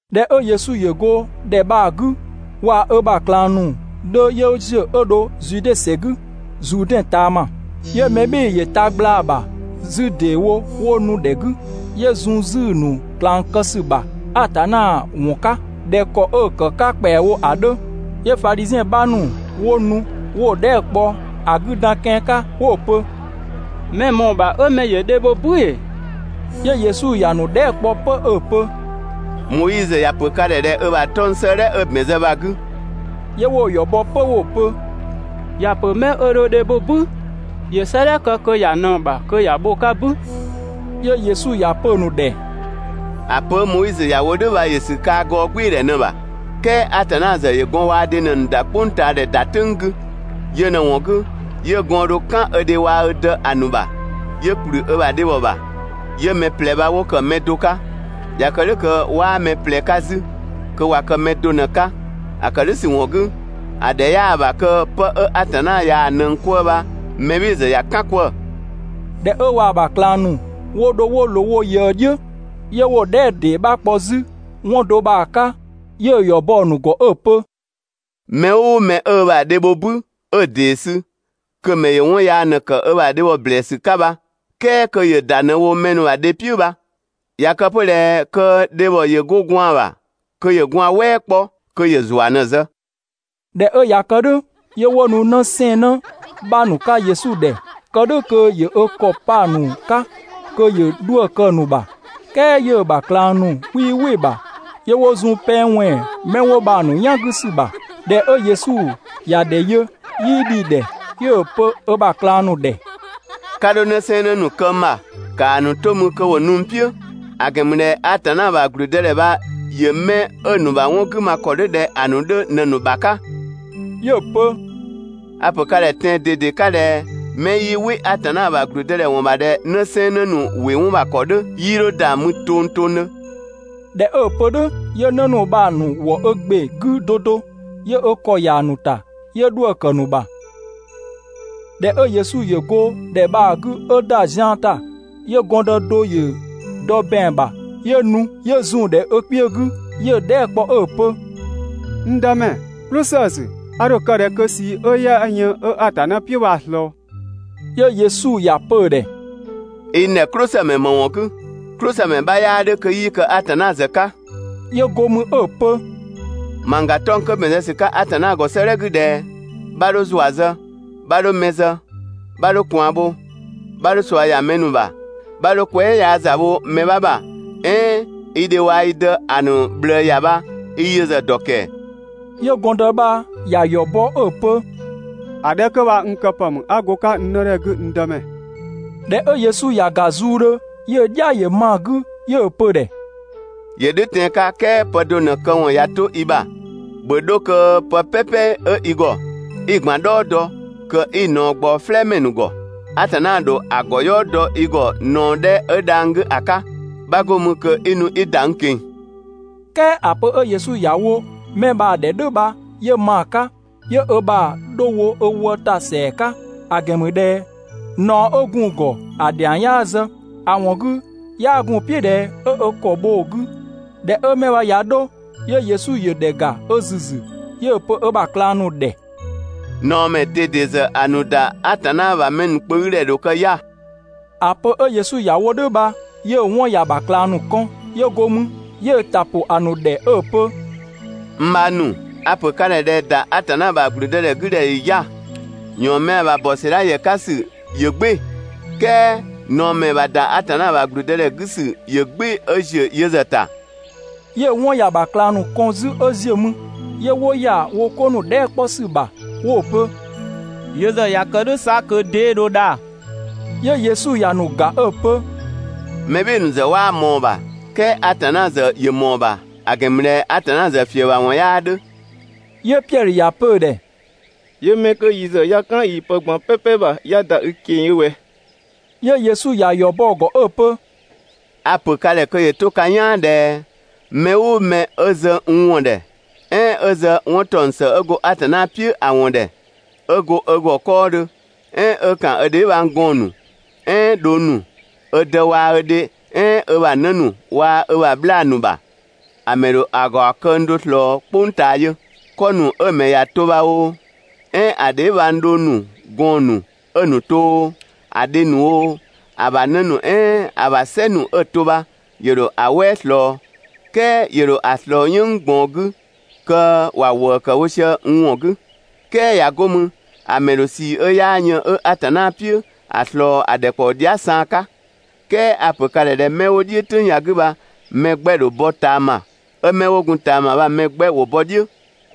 ꞊Dhɛ 'ö Yesu ‑yö go ‑dhɛ bha‑ 'gü, waa‑ ö ‑bha ꞊klang ‑nu 'dhö 'yö ‑ziö 'ö dho Zude ‑sɛ 'gü, Zuudɛn ꞊taama. 'Yö mɛ "bhɩɩ‑ ‑yö ta gblaa‑ ‑bha 'zü ‑deewo 'wo nu‑ ‑dhɛ 'gü, 'yö zun 'zü‑ ‑nu ꞊klang kë ‑sü ‑bha Atanna ‑wɔn 'ka ꞊dhɛ ‑kɔ 'ö‑ ‑kë 'ka ‑kpɛawo ‑a 'dhö. 'Yö Fadhiziɛn 'bha ‑nu 'wo nu 'wo‑ dhɛɛ" kpɔ ‑a 'gü dan kian 'ka 'wo‑ pö: «Mɛ‑ ‑mɔɔ ‑bha 'ö mɛ ‑yö dhe bho "bü ‑ee?» 'Yö Yesu ‑ya ‑nu dhɛɛ" kpɔ 'pö 'ö‑ pö: «Moizö ‑ya ‑pö ka ‑dhɛ ꞊dhɛ ö ‑bha 'tɔng‑ 'sëëdhɛ 'ö‑ ‑bɛn zë bha‑ 'gü?» 'Yö 'wo‑ ‑yɔ bɔ 'pö 'wo‑ pö: «‑Ya ‑pö 'mɛ 'ö dho dhe bho "bü ‑yö 'sëëdhɛ kë kö ‑ya ꞊nëng ‑bha kö ‑ya bho‑ 'ka "bü.» 'Yö Yesu ‑ya pö‑ ‑nu ‑dhɛ: «‑A pö 'ö Moizö ‑ya wo "dhʋ̈ bha ‑yö ‑sü kaa‑ gɔɔgbɩɩdhɛ ꞊në‑ ‑bha, "kɛɛ Atanna ‑zë ‑yö gɔn waa‑ dhe ꞊në‑ ‑nu ‑da "kpʋngtaadhɛ ‑da "tʋ̈ng 'gü. Yö ꞊në‑ ‑wɔn 'gü, 'yö gɔɔn‑ dho "kan ö dhe waa‑ ö dë ‑a ‑nu ‑bha, 'yö ‑kplü ö ‑bha dhebhɔ ‑bha, 'yö mɛ ꞊plɛ bha 'wo ‑kë pë do 'ka. ꞊Ya kë "dhʋ̈ kö 'waa mɛ ꞊plɛ 'ka 'zü, kö ꞊wa kë pë do ꞊në‑ 'ka. ‑A ‑kë "dhʋ̈ ‑sü ‑wɔn 'gü, ‑a ‑dhɛ 'yaa‑ ‑bha kö 'pë 'ö Atanna ꞊yaa‑ ꞊nëng 'kwëë‑ bha mɛ "bhɩɩ‑ ‑zë ‑ya "kan 'kwëë‑.» ꞊Dhɛ 'ö waa‑ ‑bha ꞊klang ‑nu 'wo dho 'wo ꞊loo wo ꞊yëë "dhiʋ̈, 'yö 'wo‑ dhɛɛ" ‑dee 'bha kpɔ 'zü 'wɔn do bha‑ 'ka. 'Yö‑ ‑yɔ bɔ‑ ‑nu ‑gɔ 'ö‑ pö: «Mɛ "ʋʋ mɛ 'ö ö ‑bha dhe bho "bü 'ö‑ ‑dee sü, kö‑ ‑mɛ ‑yö 'wɔn yaa ꞊në ‑kë ö ‑bha dhebhɔ ‑blɛɛsü 'ka bha, "kɛɛ kö ‑yö ‑da ꞊në wo mɛ ‑nu ‑bha dhe "piʋ̈ bha. ꞊Ya kë 'pö ꞊dhɛ kö dhebhɔ ‑yö 'go gwaan‑ ‑bha kö ‑yö gwaan‑ "wɛɛ 'kpɔ, kö ‑yö ‑zua ꞊në‑ zë. ꞊Dhɛ 'ö ꞊ya kë "dhʋ̈, 'yö 'wo nu 'në 'sɛɛnnë 'bha ‑nu 'ka Yesu ‑dhɛ, kë "dhʋ̈ kö ‑yö ö ‑kɔ 'pa‑ ‑nu 'ka kö ‑yö 'dhuë‑ kë‑ ‑nu ‑bha, "kɛɛ 'yö‑ ‑bha ꞊klang ‑nu 'wii "wɩ‑ ‑bha, 'yö 'wo zun pɛng ꞊wɛnng 'mɛ 'wo bha‑ ‑nu "yan 'gü ‑sü ‑bha. ꞊Dhɛ 'ö Yesu ‑ya ‑dhɛ yö, 'yii dhi‑ ‑dhɛ, 'yö‑ pö ö ‑bha ꞊klang ‑nu ‑dhɛ: «'Ka 'dho 'në 'sɛɛnnë ‑nu kë n ‑bha, ‑kaa ‑nu 'to mü kö ‑wo nu n "piʋ̈, ‑a ‑gɛn ‑mü ꞊dhɛ Atanna ‑bha ‑gblüdëdhɛ bha ‑yö 'mɛ 'ö‑ ‑nu ‑bha 'wɔn 'gü ma ‑kɔ 'dhö ꞊dhɛ ‑a ‑nu 'dhö ꞊në‑ ‑nu ‑bha 'ka.» 'Yö‑ pö: «A‑ ‑pö ka ‑dhɛ tɛan‑ ꞊dede 'ka ꞊dhɛ 'mɛ 'yii "wɩ Atanna ‑bha ‑gblüdëdhɛ ‑wɔn ‑bha ꞊dhɛ 'në 'sɛɛnnë ‑nu ‑wɩ 'wɔn ‑bha ‑kɔ 'dhö, 'yii 'dho ‑da mü tongtongdhö. ꞊Dhɛ 'ö‑ pö "dhʋ̈, 'yö 'në ‑nu bha‑ ‑nu ‑wɔ ö ‑gbe 'gü 'do 'do, 'yö ö ‑kɔ ‑ya ‑nu ‑ta, 'yö 'dhuë‑ ‑kë ‑nu ‑bha. ꞊Dhɛ 'ö Yesu ‑yö go ‑dhɛ bha‑ 'gü 'ö ‑da zian ‑ta, 'yö gɔndë do ‑yö dɔ ‑bɛang ‑bha 'yö nu 'yö zun‑ ‑dhɛ ö kpiö 'gü, 'yö‑ dhɛɛ" kpɔ 'ö‑ pö: «N Dëmɛ "klʋsësü, a ‑dho ‑a kë ‑kɔ ‑kë ꞊dhɛ kö 'a ꞊sii 'ö 'yaa yën 'ö Atanna "piʋ̈ bha‑ ‑slɔɔ?» 'Yö Yesu ‑ya pö‑ ‑dhɛ: «I n ‑dhɛ "klʋsëmɛ ‑më ‑wɔn 'gü? "Klʋsëmɛ 'bha 'yaa 'dhö kö 'yii kë Atanna ‑zë 'ka.» 'Yö go mü 'ö‑ pö: «Mangga 'tɔng‑ 'kö ‑bɛn zë ‑sü 'ka Atanna ‑gɔ 'sëëdhɛ 'gü ꞊dhɛ: ‹'Bha 'dho ‑zua zë, 'bha 'dho mɛ zë, 'bha 'dho ꞊kwaan bho, 'bha 'dho ꞊sua ‑ya mɛ ‑nu ‑bha, 'bha 'dho kwɛɛ" yaa ‑za bho mɛ 'bha ‑bha, "ɛɛn ü dhe waa‑ i dë ‑a ‑nu ꞊bhlëë ‑ya› bha, i yö ‑zë dɔ ‑kɛɛ?» 'Yö gɔndë bha ‑ya ‑yɔ bɔ 'ö‑ pö: «‑A 'dhɛ 'kö bha yö ‑zë n kë ‑pë ‑mü 'a go‑ 'ka n 'nëdhe 'gü, n Dëmɛ.» ꞊Dhɛ 'ö Yesu ‑ya ‑ga zuudhö, 'yö‑ "dhia ‑yö ma‑ 'gü, 'yö‑ pö‑ ‑dhɛ: «‑Yö ("dhʋ̈ tɛan‑ 'ka, "kɛɛ) pë do ꞊në‑ këwɔn ꞊ya 'to i ‑bha, ‑bhö 'dho kö pë "pɛpɛ 'ö i ‑gɔ 'i‑ ꞊gban "dhɔɔ dɔ, kö 'i‑ ‑naɔ ꞊gbaɔ "flɛɛmɛ ‑nu ‑gɔ. Atanna ‑dho ‑a ‑gɔ "yɔɔ dɔ i ‑gɔ ꞊naɔ 'dhɛ 'ö dhang‑ 'gü ‑a 'ka, 'bha 'go mü kö 'i nu 'i ‑da n ꞊keng‑. "Kɛɛ ‑a pö 'ö Yesu ‑ya wo 'mɛ bha‑ ‑dhɛ "dhʋ̈ bha 'yö ma‑ 'ka, 'yö ö ‑bha 'dho wo ö wë ‑ta ‑sɛa 'ka, ‑a ‑gɛn ‑mü ꞊dhɛ ꞊naɔ 'ö gun‑ ‑gɔ ‑a ‑dhiang 'yaa zë, (‑a ‑wɔn 'gü, 'yaa gun‑ "piʋ̈ ꞊dhɛ 'ö ö ‑kɔ bho‑ 'gü). ꞊Dhɛ 'ö 'mɛ bha ꞊ya 'dho, 'yö Yesu ‑yö ‑dhɛ ‑ga ö ‑züzü, 'yö‑ pö ö ‑bha ꞊klang ‑nu ‑dhɛ: «꞊Naɔmɛ ‑nu ꞊dede ‑zë ‑a ‑nu ‑da Atanna ‑bha mɛ ‑nu kpö 'gü ‑dhɛ ‑dho kë 'ya‑!» ‑A pö 'ö Yesu ‑ya wo "dhʋ̈ bha, 'yö‑ 'wɔn ‑ya ‑bha ꞊klang ‑nu kɔn. 'Yö go mü 'yö‑ ‑ta ‑pʋ ‑a ‑nu ‑dhɛ 'ö‑ pö: «N bhang ‑nu, a‑ ‑pö ka ‑dhɛ ꞊dhɛ ‑da Atanna ‑bha ‑gblüdëdhɛ 'gü ‑dhɛ ‑yö 'ya‑! ‑Yɔɔnmɛa ‑bha ‑bɔ ‑sɛdha ‑yɛ 'ka ‑sü ‑yö "gbɩɩ‑, "kɛɛ ꞊naɔmɛ ‑bha ‑da Atanna ‑bha ‑gblüdëdhɛ 'gü ‑sü ‑yö "gbɩɩ‑ 'ö ‑ziö yö ‑zë ‑ta.» 'Yö‑ 'wɔn ‑ya ‑bha ꞊klang ‑nu kɔn 'zü 'ö ziö mü, 'yö 'wo ‑ya wo 'ko ‑nu dhɛɛ" 'kpɔ ‑sü ‑bha 'wo‑ pö: «Yö ‑zë ꞊ya kë "dhʋ̈ 'sa kö 'dee dho dha?» 'Yö Yesu ‑ya ‑nu ‑ga 'ö‑ pö: «Mɛ "bhɩɩ‑ ‑nu ‑zë 'waa ꞊mɔɔ‑ ‑bha, "kɛɛ Atanna ‑zë ‑yö ‑mɔɔ ‑bha, ‑a ‑gɛn ‑mü ꞊dhɛ Atanna ‑zë ‑fiëbhawɔn 'yaa 'dhö.» 'Yö Piɛdhö ‑ya pö‑ ‑dhɛ: «'Yö 'mɛ 'kö yi ‑zë 'ya "kan yii‑ pë ꞊gban "pɛpɛ ‑bha 'ya ‑da i ꞊keng‑ yö ꞊wɛ?» 'Yö Yesu ‑ya ‑yɔ bɔ‑ ‑gɔ 'ö‑ pö: «A‑ ‑pö ka ‑dhɛ kö ‑yö 'to ka "yaan ꞊dhɛ mɛ "ʋʋ mɛ 'ö zë n ‑wɔn ‑dhɛ, "ɛɛn 'ö zë 'wɔn ‑taɔng ‑së 'ö go Atanna ‑a ‑wɔn ‑dhɛ, 'ö go ö ‑gɔ 'kɔɔdhö, "ɛɛn 'ö ‑kan ö dheebhang gɔɔn‑ ‑nu, "ɛɛn dhong ‑nu, ö dë waa‑ ö dhe "ɛɛn ö ‑bha 'në ‑nu waa‑ ö ‑bha 'bhlaa‑ ‑nu ‑bha, ‑a ‑mɛ ‑dho ‑a ‑gaɔ këng do ꞊slɔɔ "kpʋng ꞊taa yö, 'kɔ ‑nu 'ö‑ ‑mɛ ‑ya to bha oo, "ɛɛn ‑a dheebhang dhong ‑nu, gɔɔn ‑nu 'ö‑ ‑nu to oo, ‑a dhe ‑nu oo, ‑a ‑bha 'në ‑nu "ɛɛn ‑a ‑bha "sɛ ‑nu 'ö‑ to bha, ‑yö ‑dho ‑a "wɛɛ ꞊slɔɔ, "kɛɛ ‑yö ‑dho ‑a ꞊slɔɔ "yënng ꞊gbaɔn 'gü kö ‑wa ‑wëë ‑kë wo sië n ‑wɔn 'gü. "Kɛɛ ꞊ya 'go mü, ‑a ‑mɛ ‑dho ꞊sii 'ö 'yaa yën 'ö Atanna "piʋ̈, ‑a ‑slɔɔ ‑a ‑dhɛkpaɔ dhia" saan 'ka. "Kɛɛ a‑ ‑pö ka ‑dhɛ ꞊dhɛ 'mɛ 'wo "dhiʋ̈, "tʋ̈ng ya‑ 'gü bha‑ mɛ 'gbɛ‑ ‑dho bɔ ꞊taama, 'ö 'mɛ 'wo gun ꞊taama bha‑ mɛ 'gbɛ ‑wo bɔ "dhiʋ̈.»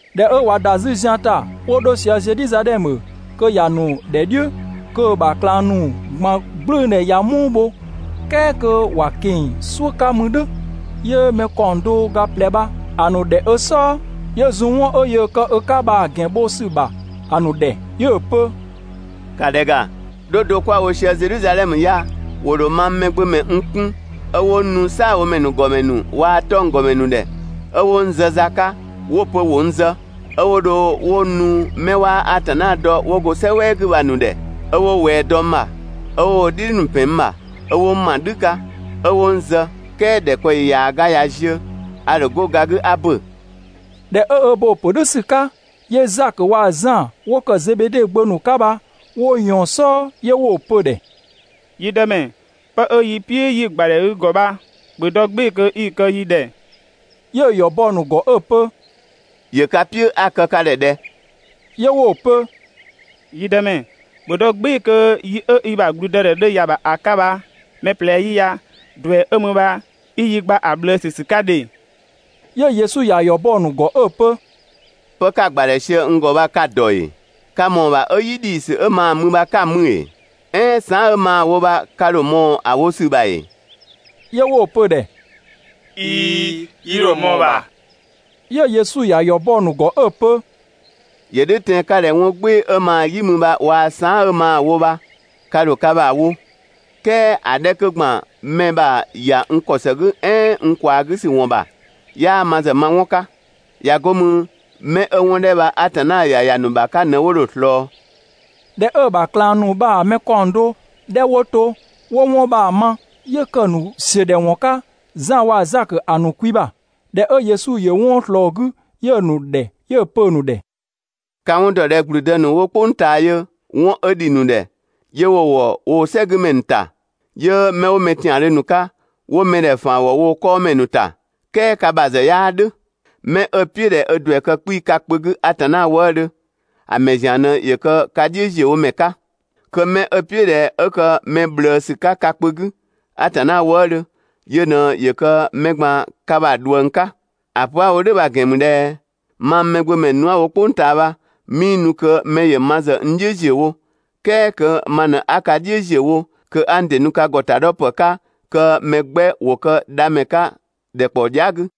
꞊Dhɛ 'ö ꞊wa ‑da 'zü zian ‑ta 'wo 'dho sië Zedhizadhɛmö, kö ‑ya ‑nu ‑dhɛ "dhiʋ̈, kö‑ ‑bha ꞊klang ‑nu ꞊gban "gblʋ̈ʋ̈dhɛ ꞊ya "muu bho, "kɛɛ kö ‑wa ꞊keng‑ "suʋ̈ 'ka mü "dhʋ̈, ‑yö mɛ ‑kaɔng do ga ꞊plɛ bha‑ ‑nu ‑dhɛ ö "sɔɔ, 'yö zun 'wɔn 'ö yöö kë ö 'ka bha‑ ‑gɛn bho ‑sü ‑bha ‑a ‑nu ‑dhɛ. 'Yö‑ pö: «‑Ka ‑dhɛ ‑ga, 'dho do 'kwa‑ wo sië Zedhizadhɛmö ya, ‑wo ‑dho mang Mɛgbömɛ n 'kun, 'ö 'wo n nu "saabhomɛ ‑nu ‑gɔmɛ ‑nu waa‑ 'tɔnggɔmɛ ‑nu ‑dhɛ, 'ö 'wo n zë za 'ka, 'wo‑ pö ‑wo n zë, 'ö 'wo dho 'wo n nu 'mɛ 'waa Atanna dɔ 'wo go "sɛ "wɛɛ 'gü bha‑ ‑nu ‑dhɛ. 'Ö 'wo ꞊wɛɛ dɔ n ‑bha, 'ö 'wo wo "dhidhi ‑pɛn n ‑bha, 'ö 'wo n ma "dhü 'ka, 'ö 'wo n zë, "kɛɛ ‑dhɛkpaɔyi ‑yaaga ꞊ya ziö, a ‑dho 'go ga 'gü 'a ‑bö.» ꞊Dhɛ 'ö ö bo‑ ‑pö "dhʋ̈ ‑sü 'ka, 'yö Zakö waa‑ Zan 'wo ‑kë Zebede gbö ‑nu 'ka bha, 'wo ꞊yɔɔn‑ "sɔɔ, 'yö 'wo‑ pö‑ ‑dhɛ: «Yi Dëmɛ, 'pë 'ö yi "piʋ̈ 'yi‑ ‑gbadhɛ i ‑gɔ ‑bha, ‑bhö dɔ "gbɩɩ‑ kö 'i‑ kë yi ‑dhɛ.» 'Yö‑ ‑yɔ bɔ‑ ‑nu ‑gɔ 'ö‑ pö: «‑Yö ka "piʋ̈ 'a‑ kë ka ‑dhɛ ꞊dhɛ?» 'Yö 'wo‑ pö: «Yi Dëmɛ, ‑bhö dɔ "gbɩɩ‑ kö yi 'ö i ‑bha ‑gblüdëdhɛ dho ‑ya ‑bha ‑a 'ka bha, mɛ ꞊plɛ 'yi ya ‑duɛ 'ö mü bha i yi gba ‑a ꞊bhlëësü ‑sü 'ka ‑dhe!» 'Yö Yesu ‑ya ‑yɔ bɔ‑ ‑nu ‑gɔ 'ö‑ pö: «Pë 'ka‑ ‑gbadhɛ sië n ‑gɔ bha ka‑ ‑dɔ ‑ee? Ka ‑mɔɔ ‑bha 'ö "yi ‑dhiisü 'ö maa mü bha 'ka‑ mü ‑ee? "Ɛɛn saan" 'ö maa‑ wo bha ka ‑dho ꞊mɔɔ‑ wo ‑sü ‑bha ‑ee?» 'Yö 'wo‑ pö‑ ‑dhɛ: «꞊Iin, yi ‑dho ꞊mɔɔ‑ ‑bha.» 'Yö Yesu ꞊ya ‑yɔ bɔ‑ ‑nu ‑gɔ 'ö‑ pö: «‑Yö "dhʋ̈ tɛan‑ 'ka ꞊dhɛ 'wɔn "gbɩɩ‑ 'ö maa‑ "yi mü bha waa‑ saan" 'ö maa‑ wo bha, ka ‑dho ka ‑bha wo, "kɛɛ ‑a 'dhɛ 'kö ‑gban mɛ ‑bha ‑ya n ‑kɔ ‑së "ɛɛn n ꞊kwaa 'gü ‑sü ‑wɔn ‑bha, 'yaa ma ‑zë ma 'wɔn 'ka. ꞊Ya 'go mü, 'mɛ 'ö 'wɔn 'dhɛ bha Atanna ‑ya ‑ya ‑nu ‑bha 'ka ꞊në 'wo dho‑ ꞊slɔɔ.» ꞊Dhɛ 'ö‑ ‑bha ꞊klang ‑nu bha‑ mɛ ‑kaɔng do 'dhɛ 'wo to 'wo 'wɔn bha‑ ma, 'yö ‑kë ‑nu ‑siödhɛwɔn 'ka Zan waa‑ Zakö ‑a ‑nu kwi ‑bha. ꞊Dhɛ 'ö Yesu ‑yö 'wɔn ꞊slɔɔ‑ 'gü, 'yö‑ ‑nu ‑dhɛ 'yö‑ pö‑ ‑nu ‑dhɛ: «Ka‑ 'wɔn dɔ ꞊dhɛ ‑gblüdë ‑nu 'wo "kpʋng ꞊taa yö 'wɔn 'ö ‑dhi ‑nu ‑dhɛ, 'yö 'wo‑ ‑wɔ woo‑ "sɛgümɛ ‑nu ‑ta, 'yö 'mɛ 'wo mɛ ‑tiandhö ‑nu 'ka, 'wo mɛ ‑dhɛ ‑faan ‑wɔ wo ꞊kɔɔnmɛ ‑nu ‑ta, "kɛɛ ka ‑zë ka ‑bha 'yaa "dhʋ̈. 'Mɛ 'ö‑ "piʋ̈ ꞊dhɛ ö ‑duɛ kë 'kpii‑ ka kpö 'gü Atanna wëëdhö, ‑a ‑mɛ ‑zian ꞊në ‑yö kë ka "dhiʋ̈ ‑ziö wo ‑mɛ 'ka. Kö 'mɛ 'ö‑ "piʋ̈ ꞊dhɛ 'ö kë mɛ ꞊bhlëësü 'ka ka kpö 'gü (Atanna wëëdhö), yö ꞊në ‑yö kë mɛ ꞊gban ka ‑bha ꞊dhuëng 'ka. ‑A pö 'a‑ wo "dhʋ̈ bha‑ ‑gɛn ‑mü ꞊dhɛ mang Mɛgbömɛ nu 'a‑ wo "kpʋng ꞊taa bha, 'mii nu kö mɛ ‑yö ma ‑zë n "dhiʋ̈ ‑ziö wo, "kɛɛ kö ma ꞊në 'a ka "dhiʋ̈ ‑ziö wo, kö 'a n ‑dɩ nu ka ‑gɔtadhɔpë 'ka kö mɛ 'gbɛ ‑wo kë dhamɛ 'ka ‑dhɛkpaɔ dhia" 'gü.»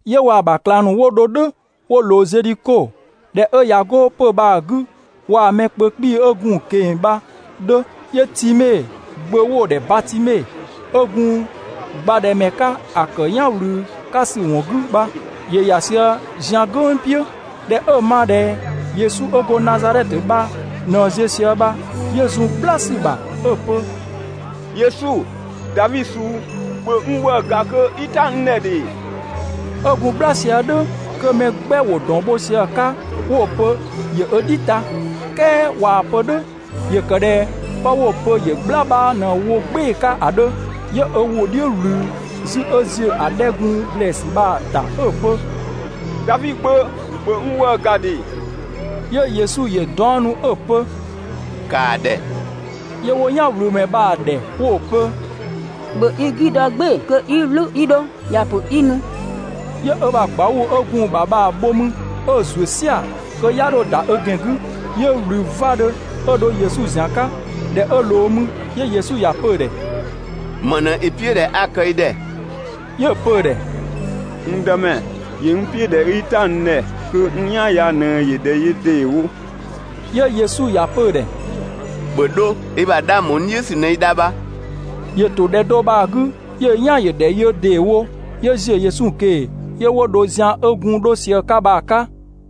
'Yö waa‑ ‑bha ꞊klang ‑nu 'wo dho "dhʋ̈ 'wo ꞊loo Zedhiko. ꞊Dhɛ 'ö ꞊ya 'go 'pö‑ bha‑ 'gü, waa‑ mɛ kpö 'kpii‑ 'ö gun‑ ꞊keng‑ bha‑ 'dhö, kö Time gbö 'wo‑ ‑dhɛ Batime 'ö gun gbadhɛmɛ 'ka ‑a ‑kë "yan ‑wlü 'ka ‑sü ‑wɔn 'gü bha, ‑yö ‑ya sië zian "gʋ̈ng "piʋ̈. ꞊Dhɛ 'ö‑ ma ꞊dhɛ Yesu 'ö go Nazadhɛtö bha ꞊në ziö sië bha, 'yö zun "gbla ‑sü ‑bha 'ö‑ pö: «Yesu, Davi suu, ‑bhö n ‑wëë ‑ga kö 'i "ta n ‑dhɛ ‑dhe!» 'Ö gun "gbla sië "dhʋ̈ kö mɛ 'gbɛ ‑wo ‑dɔn bho sië‑ 'ka 'wo‑ pö ‑yö ö "dhi ta. "Kɛɛ ꞊waa‑ pö‑ ‑dhɛ "dhʋ̈ ‑yö ‑kë ꞊dhɛ 'pë 'wo‑ pö ‑yö "gbla 'bha ꞊në wo "gbɩɩ‑ 'ka ‑a 'dhö, 'yö ö ‑wʋ "dhiʋ̈ ꞊wlü 'zü 'ö ‑ziö ‑a 'dhɛ 'ö gun ‑blɛɛsü bha‑ ‑ta 'ö‑ pö: «Davi Gbö, ‑bhö n ‑wëë ‑ga ‑dhe!» 'Yö Yesu ‑yö 'daɔnnu 'ö‑ pö: «‑Kaa ‑dhɛ!» 'Yö 'wo "yanwlümɛ bha‑ ‑dhɛ 'wo‑ pö: «‑Bhö i 'gü dɔ "gbɩɩ‑ kö 'i "wlü 'i 'dho, ‑ya ‑pö 'i nu!» 'Yö ö ‑bha ꞊gbauu‑ 'ö gun‑ ‑bha bha‑ bho 'mü 'ö‑ ‑zuö "sia‑ (kö 'ya 'dho ‑da ö ‑gɛn 'gü), 'yö ꞊wlü 'vadhö 'ö dho Yesu ‑zian 'ka. ꞊Dhɛ 'ö ꞊loo mü, 'yö Yesu ‑ya pö‑ ‑dhɛ: «‑Më ꞊në i "piʋ̈ ꞊dhɛ 'a‑ kë i ‑dhɛ?» 'Yö‑ pö‑ ‑dhɛ: «N Dëmɛ, ‑yö n "piʋ̈ ꞊dhɛ 'i "ta n ‑dhɛ kö n "yan ya ꞊në ‑yö ‑dhɛ yö ‑deewo!» 'Yö Yesu ‑ya pö‑ ‑dhɛ: «‑Bhö 'dho, i ‑bha 'dhang ‑bho n "dhiʋ̈ ‑sü ꞊në i dha bha.» ‑Yö ‑to ‑dhɛ do bha‑ 'gü 'ö‑ "yan ‑yö ‑dhɛ yö ‑deewo, 'yö ‑ziö Yesu ꞊keng‑ 'yö 'wo dho zian 'ö gun 'dho sië‑ 'ka bha‑ 'ka.